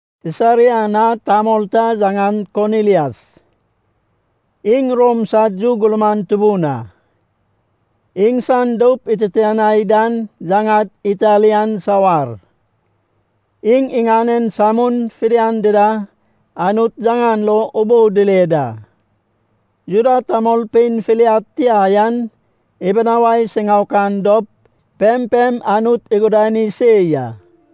Sisaria na tamol ta yaŋan Konilias, iŋ Rom sad yu gurman tubun a. Iŋsan doup ititianai dan yaŋad “Italian Sawar”. Iŋ, iŋanen samun fidian dida Anut yaŋan lo ubou dile da. Juda tamolpein filiad tia yan ibunawai siŋaokan dop, pempem Anut igudani se ya.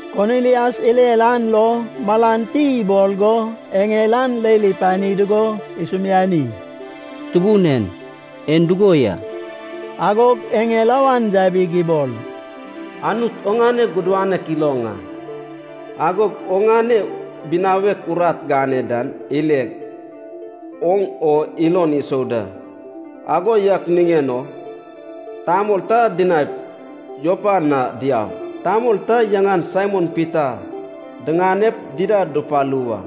Konilias irer an lo malan ti ibol go eŋel an leil ipani dugo isumiani, “Tubun en. En dugo ya?” Agog eŋel awan yabig ibol, “Anut oŋane gudanek iloŋ a. Agod oŋane binawek urat gane dan ileg, oŋ o ilon isou da. Ago yak niŋen o tamol ta dinaip Jopa na diaup, tamol ta yaŋan Saimon Pita diŋanep dida dupalu wa.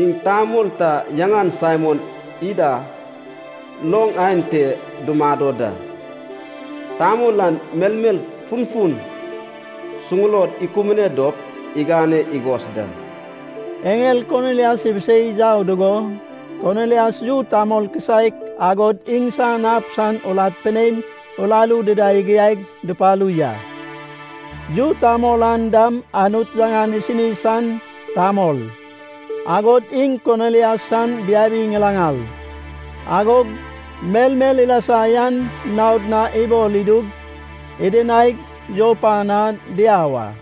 Iŋ tamol ta yaŋan Saimon ida loŋ aen te dumado da. Tamol an melmel funfun suŋulod ikubune dop igane igos da.” Eŋel Konilias ibisei yau dugo, Konilias yu tamol kisaek, agod iŋsan ab san urat pinein uraru dida igiaig dupalu ya. Yu tamol an dam Anut yaŋan isini san tamol, agod iŋ Konilias san biabi ŋilaŋal. Agog melmel ilasa yan naod na ibol idug, idinaig Jopa na diau a.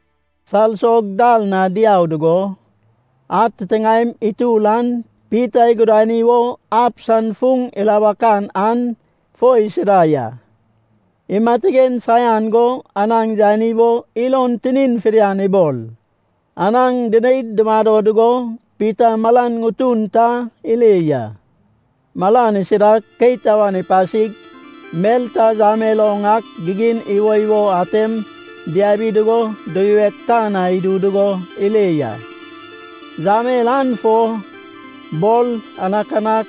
Salsog dal na diau dugo, ad titiŋaem itur an Pita igudani wo ab san fuŋ ilabakan an fo isida ya. Imatigen saian go anaŋ yani wo ilon tinin fidian ibol. Anaŋ dineid dumado dugo Pita malan ŋutun ta ile ya. Malan isidag keit awan ipasig mel ta yamel oŋ ak gigin iwoiwo atem diabi dugo duyuweg tan na idu dugo ile ya. Yamel an fo bor, anakanak,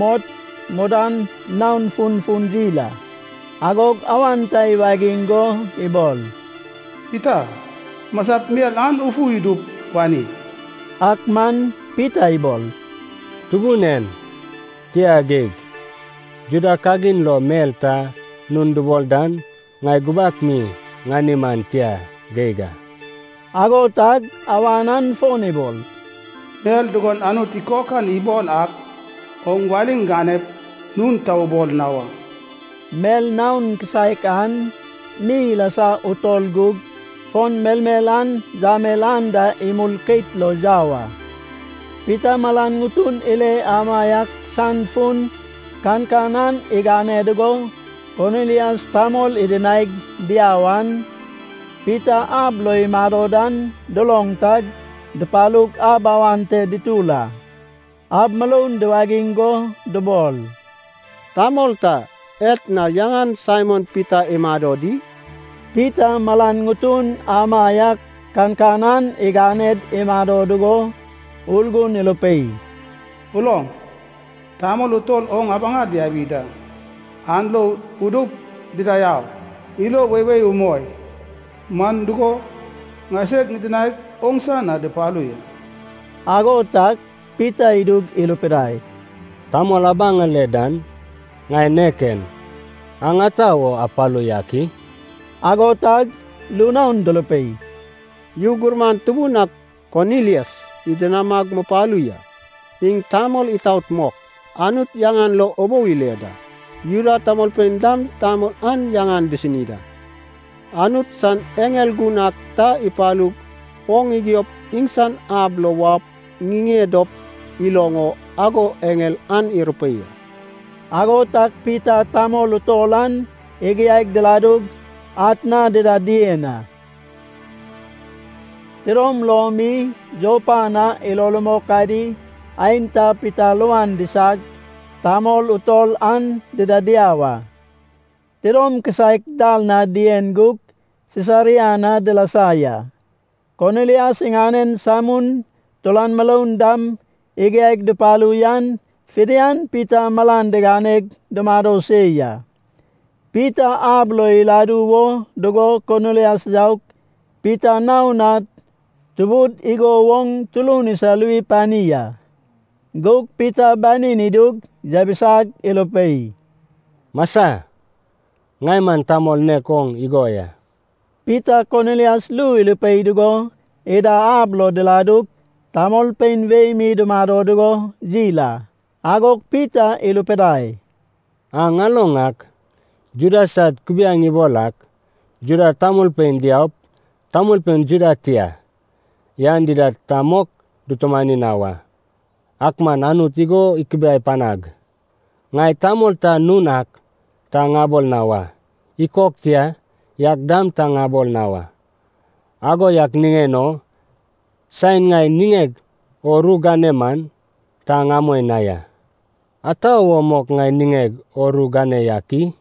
mot, mudan naon funfun yil a. Agog awan ta iwagiŋ go ibol, “Pita, masap mel an ufu idup wani.” Ak man Pita ibol, “Tubun en, tia geig. Juda kagin lo mel ta nun dubol dan ŋai gubak mi ŋani man tia geig a.” Ago tag awan an fon ibol, “Mel dugon Anut ikokan ibol ak, oŋ waliŋ ganep, nun ta ubol na wa.” Mel naon kisaek an mi ilasa utol gug, fon melmel an yamel anda imul keit lo yau a. Pita malan ŋutun ile amaiak san fun kankan an igane dugo, Konilias tamol idinaig diau an Pita ab lo imado dan duloŋ tag dupalug ab awan te dutur a. Ab muroun duwagiŋ go dubol, “Tamol ta etna yaŋan Saimon Pita imado di?” Pita malan ŋutun amaiak kankan an iganed imado dugo Urgun irupei, “Uloŋ, tamol utol oŋ abaŋa diabi da. An lo udup, dida au. Ilo weiwei umoi. Man dugo, ŋaiseg ŋidinaig, oŋsa na dupalu ya.” Ago tag Pita idug irupidai, “Tamol abaŋale dan ŋai nek en. Aŋ ata wo apalu yak i?” Ago tag ru naon durupei, “Yu gurman tubun ak Konilias idinamag mupalu ya. Iŋ tamol itaot mok, Anut yaŋan lo ubou ile da. Juda tamolpein dam tamol an yaŋan disini da. Anut san eŋel gun ak ta ipalug oŋ igiop iŋsan ab lo waup ŋiŋe dop iloŋ o ago eŋel an irupei a.” Ago tag Pita tamol utol an igiaig diladug atna dida dien a. Tidom lom mi, Jopa na ilo rumok adi aenta Pita luan disag, tamol utol an dida diau a. Tidom kisaek dal na dien gug Sisaria na dilasa ya. Konilias iŋanen samun, turan muroun dam igiaig dupalu yan fidian Pita malan diganed dumado se ya. Pita ab lo iladu wo dugo Konilias yaug Pita naon na tubud igo woŋ turun isaluwi pani a. Gug Pita banin idug yabisag irupei, “Masa, ŋai man tamol nek oŋ igo ya.” Pita Konilias ru irupei dugo ida ab lo diladug, tamolpein wei mi dumado dugo yil a. Agog Pita irupidai, “Aŋ aloŋ ak. Juda sad kubiaeŋ ibol ak, Juda tamolpein diaup tamolpein Juda tia yan dida ta mok dutumani na wa. Ak man Anut igo ikubiai panag, ŋai tamol ta nun ak ta ŋabol na wa. Ikok tia yak dam ta ŋabol na wa. Ago yak niŋen o saen ŋai niŋeg o ru gane man ta ŋamoi na ya. Ata wo mok ŋai niŋeg o ru gane yak i?”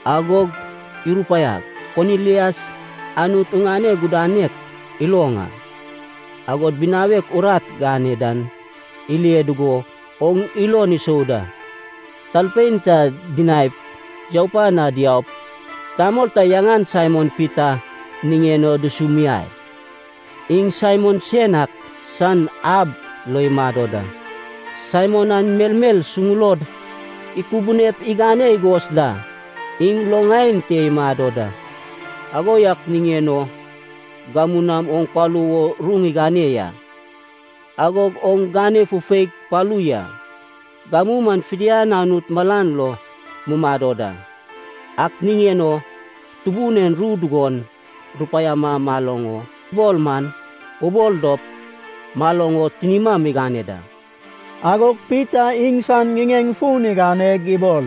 Agog irupaiag, ‘Konilias, Anut oŋane gudanek iloŋ a. Agod binawek urat gane dan ile dugo oŋ ilon isou da. Talpein ta dinaip Jopa na diaup, tamol ta yaŋan Saimon Pita niŋen o dusumiai. Iŋ Saimon sen ak san ab lo imado da. Saimon an melmel suŋulod ikubunep igane igos da. Iŋ loŋ aen te imado da.’ Ago yak niŋen o gamu nam oŋ palu wo ru ŋigane ya. Agog oŋ gane fufeig palu ya. Gamu maŋ fidian Anut malan lo mumado da. Ak niŋen o Tubun en ru dugon rupaiama maloŋ o ibol man, ubol dop maloŋ o tinima migane da.” Agog Pita iŋsan ŋiŋeŋ fun iganeg ibol,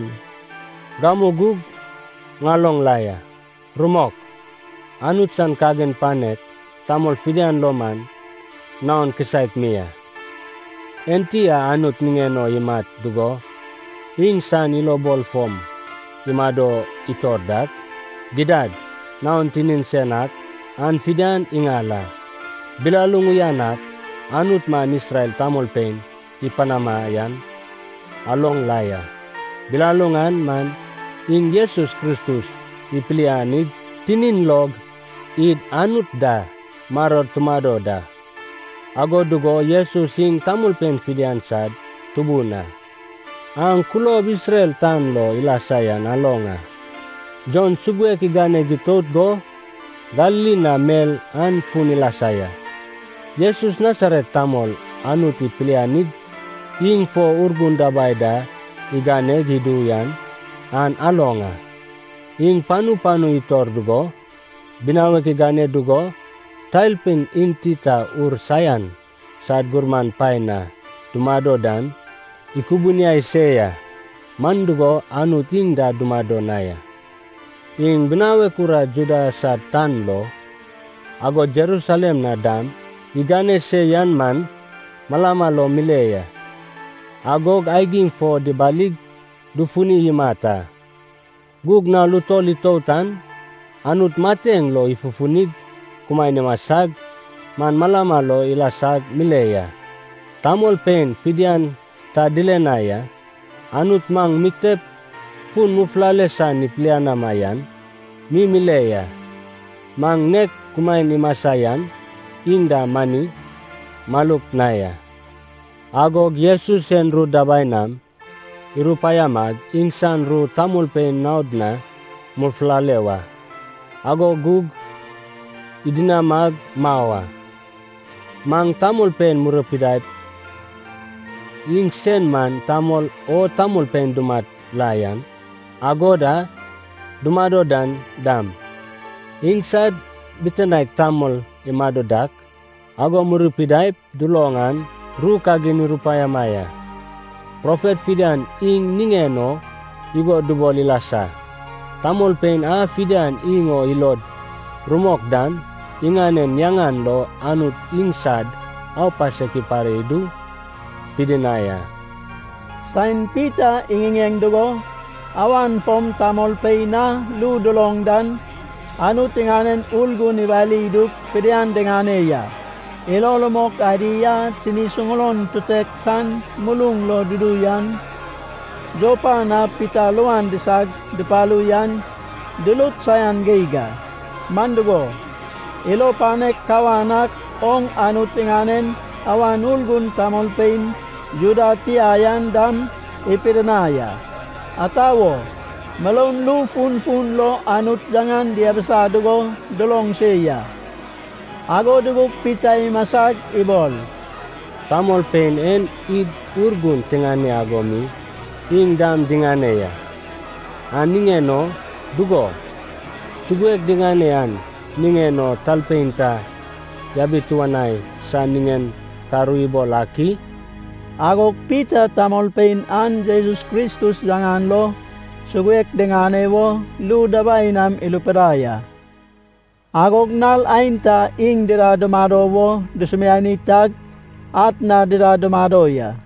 “Gamu gug ŋaloŋ la ya. Rumok, Anut san kagin panek tamol fidian lo man naon kisaek mi a. Enti a Anut niŋen o imat dugo, iŋsan ilobol fom imado itor dak, gidad naon tinin sen ak an fidian iŋal a. Bilaluŋ uyan ak Anut maŋ Isrel tamolpein ipanama yan aloŋ la ya. Bilaluŋ an man iŋ Jesus Kristus ipilianig, tinin log id Anut da maror tumado da. Ago dugo Jesus iŋ tamolpein fidian sad Tubun a. Aŋ kulob Isrel tan lo ilasa yan aloŋ a. Jon suguek iganeg itout go, Galili na mel an fun ilasa ya. Jesus Nasaret tamol Anut ipilianig, iŋ fo Urgun dabai da iganeg idu yan aŋ aloŋ a. Iŋ panu panu itor dugo binawek igane dugo, talpein enti ta ur saian sad gurman paen na dumado dan ikubuniai se ya. Man dugo, Anut iŋ da dumado na ya. “Iŋ binawek urat Juda sad tan lo, agod Jerusalem na dam igane se yan maŋ malama lo mile ya. Agog aigim fo dibalig dufuni imat a. Gug nal utol itout an, Anut mateŋ lo ifufunig kumaen imasag, maŋ malama lo ilasag mile ya. Tamolpein fidian ta dile na ya. Anut maŋ mitep fun mufulale san ipilianama yan mi mile ya. Maŋ nek kumaen imasa yan iŋ da mani maluk na ya. Agog Jesus sen ru dabai nam irupaiamag iŋsan ru tamolpein naod na mufulale wa, ago gug idinamag mau a. Maŋ tamolpein murupidaip, iŋsen man tamol a tamolpein dumat la yan, agod a dumado dan dam, iŋsad bitinaek tamol imado dak ago murupidaip duloŋ an ru kagin irupaiama ya. Profet fidian iŋ niŋen o igo dubol ilasa, ‘Tamolpein a fidian iŋ o ilod rumok dan, iŋanen yaŋan lo Anut iŋsad aupasek ipare idu pidinai a.’” Saen Pita iŋiŋeŋ dugo, awan fom tamolpein a ru duloŋ dan Anut iŋanen Urgun iwali idug fidian diŋane ya. Ilo rumok adi a tini suŋulon tutek san muluŋ lo dudu yan Jopa na Pita luan disag dupalu yan, durut saian geig a. Man dugo, ilo panek kawan ak oŋ Anut iŋanen Awan Urgun tamolpein Juda tia yan dam ipidinai a. Ata wo? Muroun ru funfun lo Anut yaŋan diabisa dugo duloŋ se ya. Ago dugug Pita imasag ibol, “Tamolpein en id Urgun tiŋane ago mi iŋ dam diŋane ya. An niŋen o, dugo, suguek diŋane an niŋen o talpein ta yabituanai san niŋen ka ru ibol ak i?” Agog Pita tamolpein an Jesus Kristus yaŋan lo suguek diŋane wo ru dabai nam irupidai a. Agog nal aenta iŋ dida dumado wo dusumiani tag atna dida dumado ya.